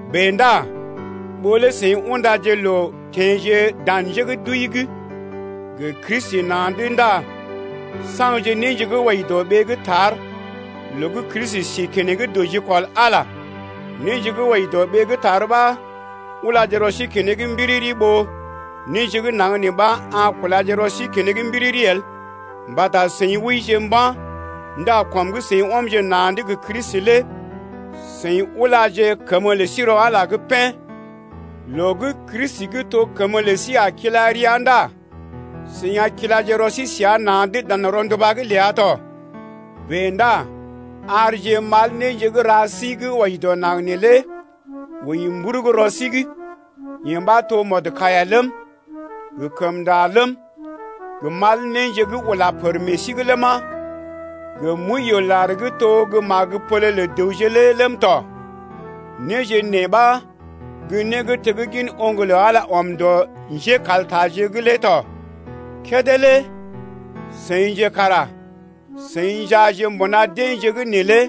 Bèe ndá ɓó lé seḭ undaje loo teḛje dan njé gə́ d’wəi’g gə Kristi na̰’d ndá saŋgje néje gə́ wɔji dɔ ɓee gə́ tar loo gə́ Kristi sí keneŋ dɔ jikɔl Ala’g lé. Néje gə́ wɔji dɔ ɓee gə́ tar ɓa ulaje rɔ sí keneŋ mbiriri ɓó néje gə́ naŋg nee ɓa a kulaje rɔ sí keneŋ mbiriri el. Mbata seḭ wəije mba̰ ndá kɔm gə́ seḭ ɔmje na̰’d gə Kristi lé seḭ ulaje kəmə lə sí rɔ Ala’g pḛ́. Loo gə́ Kristi gə́ to gə́ kəmə lə sí a kila rəa ndá seḭ a kilaje rɔ sí səa na̰’d dan rɔnduba’g ləa tɔ. Bèe ndá arje mal néje gə́ ra sí gə́ wɔji dɔ naŋg neelé wəi mburug rɔ sí’g, yee ɓa to mɔdkaiya ləm, gə kəmnda ləm, gə mal néje gə́ ula pər meḛ sí’g ləma, gə mwəiyoolar gə́ to gə́ magəpole lə dəwje lé ləm tɔ. Néje nee ɓa gə́ né gə́ teggin oŋg gə́ Ala ɔm dɔ njékaltaje’g lé tɔ. Kédé lé seḭje kara seḭ njaaje mbuna deḛje’g neelé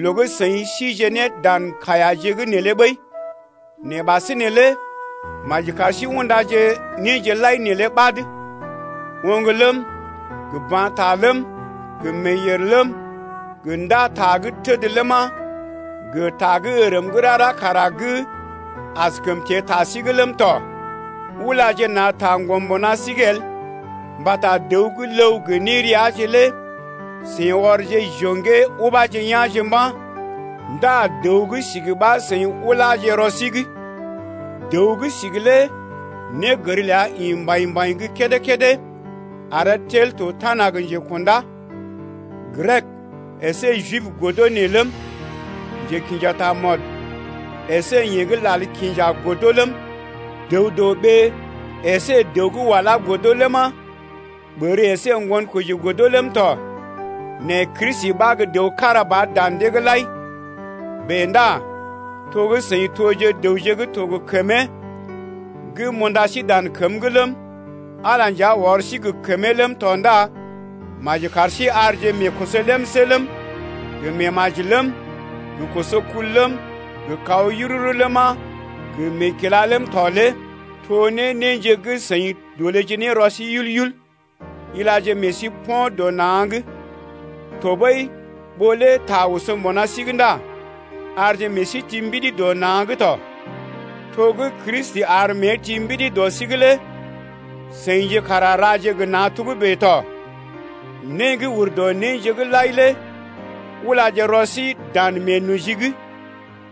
loo gə́ seḭ síje ne dan kaiyaje’g neelé ɓəi. Nɛ ɓasinè lé maji kar sí undaje néje lai neelé ɓad: Oŋg ləm, gə ba̰ ta ləm, gə meeyèr ləm, gə ndá ta gə́ təd ləma, gə ta gə́ ərm gə́ rara kara gə́ askəm teḛ ta sí’g ləm tɔ. Ulaje na̰ taŋgɔm mbuna sí’g el mbata dəw gə́ ləw gə néreaje lé seḭ ɔrje jo̰gee ubaje ya̰je mba̰ 0ndá dəw gə́ sigi ɓa seḭ ulaje rɔ sí’g ya. Dəw gə́ sigi lé négər ləa ḭ mbaḭ-mbaḭ gə́ kédé-kédé aree tel to tana gə njekṵdá. Grek əsé Jib godo nee ləm, njekḭja tamɔd əsé yeḛ gə́ lal kinja godo ləm, dəw-dɔ-ɓee əsé dəw walá godo ləma, ɓər əsé ŋgonkoji godo ləm tɔ, nɛ Kristi ɓa gə́ dəw kára ba dan dee’g lai. Bèe ndá to gə́ seḭ toje dəwje gə́ to gə kəmee gə́ m’unda sí dan kəm’g ləm, Ala lé nja ɔr sí gə kəmee ləm tɔ ndá maji kar sí arje meekoso lemsé ləm, gə meemaji ləm, gə kosokul ləm, gə kaw yururu ləma, gə meekila ləm tɔ lé to ne néje gə́ seḭ dolèje ne rɔ sí yul-yul ya. Ilaje meḛ sí po̰ dɔ na̰’g tɔɓəi ɓó lé ta oso mbuna sí’g ndá arje meḛ sí ti mbidi dɔ na̰’g tɔ. To gə́ Kristi ar mée ti mbidi dɔ sí’g lé seḭje kara raje gə na̰ togə́bè tɔ. Né gə́ ur dɔ néje’g lai lé ulaje rɔ sí dan meenoji’g,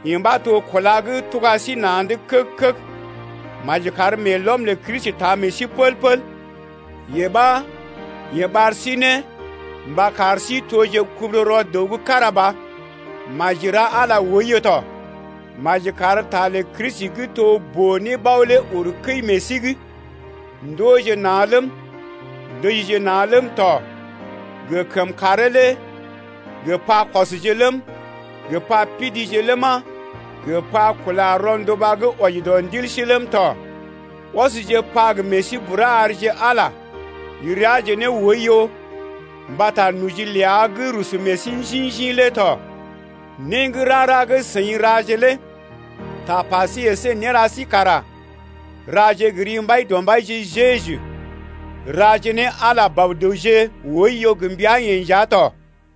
yee ɓa to kúla gə́ tuga sí na̰’d keg-keg. Maji kar meelɔm lə Kristi taa meḛ sí pəl-pəl, yee ɓa yeḛ ɓar sí ne mba kar sí toje kubururɔ dəw gə́ kára ba. Maji ra Ala oiyo tɔ. Maji kar ta lə Kristi gə́ to boo-nébao lé uru kəi meḛ sí’g. Ndooje na̰ ləm, ndəjije na̰ ləm tɔ gə kəmkàree lé gə pakɔsje ləm, gə pa pidije ləma, gə pa kula rɔnduba gə́ wɔji dɔ ndil sí ləm tɔ. Ɔsje pa gə meḛ sí bura arje Ala reaje ne oiyo mbata noji ləa gə́ rusu meḛ sí njḭ-njḭ lé tɔ. Né gə́ rara gə́ seḭ raje lé tapa sí əsé néra sí kara raje gə ri Mbaidɔmbaije Jeju, raje ne Ala Bɔ-dəwje oiyo gə mbəa-yeḛ nja tɔ.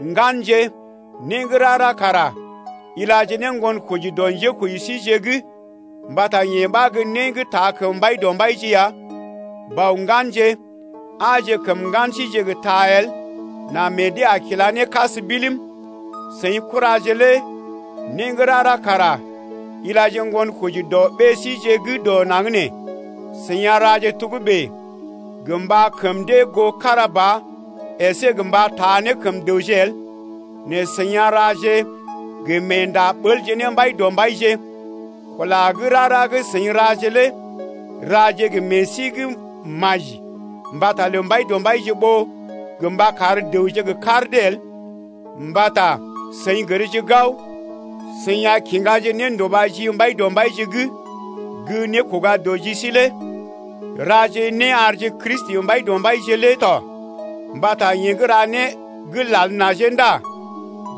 Ŋganje, né gə́ rara kara ilaje ne ŋgonkoji dɔ njékoji síje’g mbata yee ɓa gə́ né gə́ taa kəm Mbaidɔmbaije ya. Bɔ-ŋganje, aaje kəm ŋgan síje gə ta el nà meḛ dee a kila ne kas bilim. Seḭ kuraje lé né gə́ rara kara ilaje ŋgonkoji dɔ ɓée síje gə́ dɔ naŋg nee, seḭ a raje togə́bè gə mba kəm dee goo kára ba əsé gə mba taa ne kəm dəwje el nɛ seḭ a raje gə meenda ɓəlje ne Mbaidɔmbaije ya. Kula gə́ rara gə́ seḭ raje lé raje gə meḛ sí gə́ maji mbata lə Mbaidɔmbaije ɓó gə mba kar dəwje gə kar dee el, mbata seḭ gərje gao, seḭ a kiŋgaje nénduba ji Mbaidɔmbaije’g gə́ nékoga dɔ ji sí lé. Raje né arje Kristi Mbaidɔmbaije lé tɔ. Mbata yeḛ gə́ ra né gə́ lal najee ndá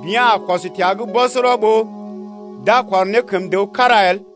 bea̰ a kɔs təa’g bɔsɔrɔ, ɓó d’a kɔr ne kəm dəw kára el!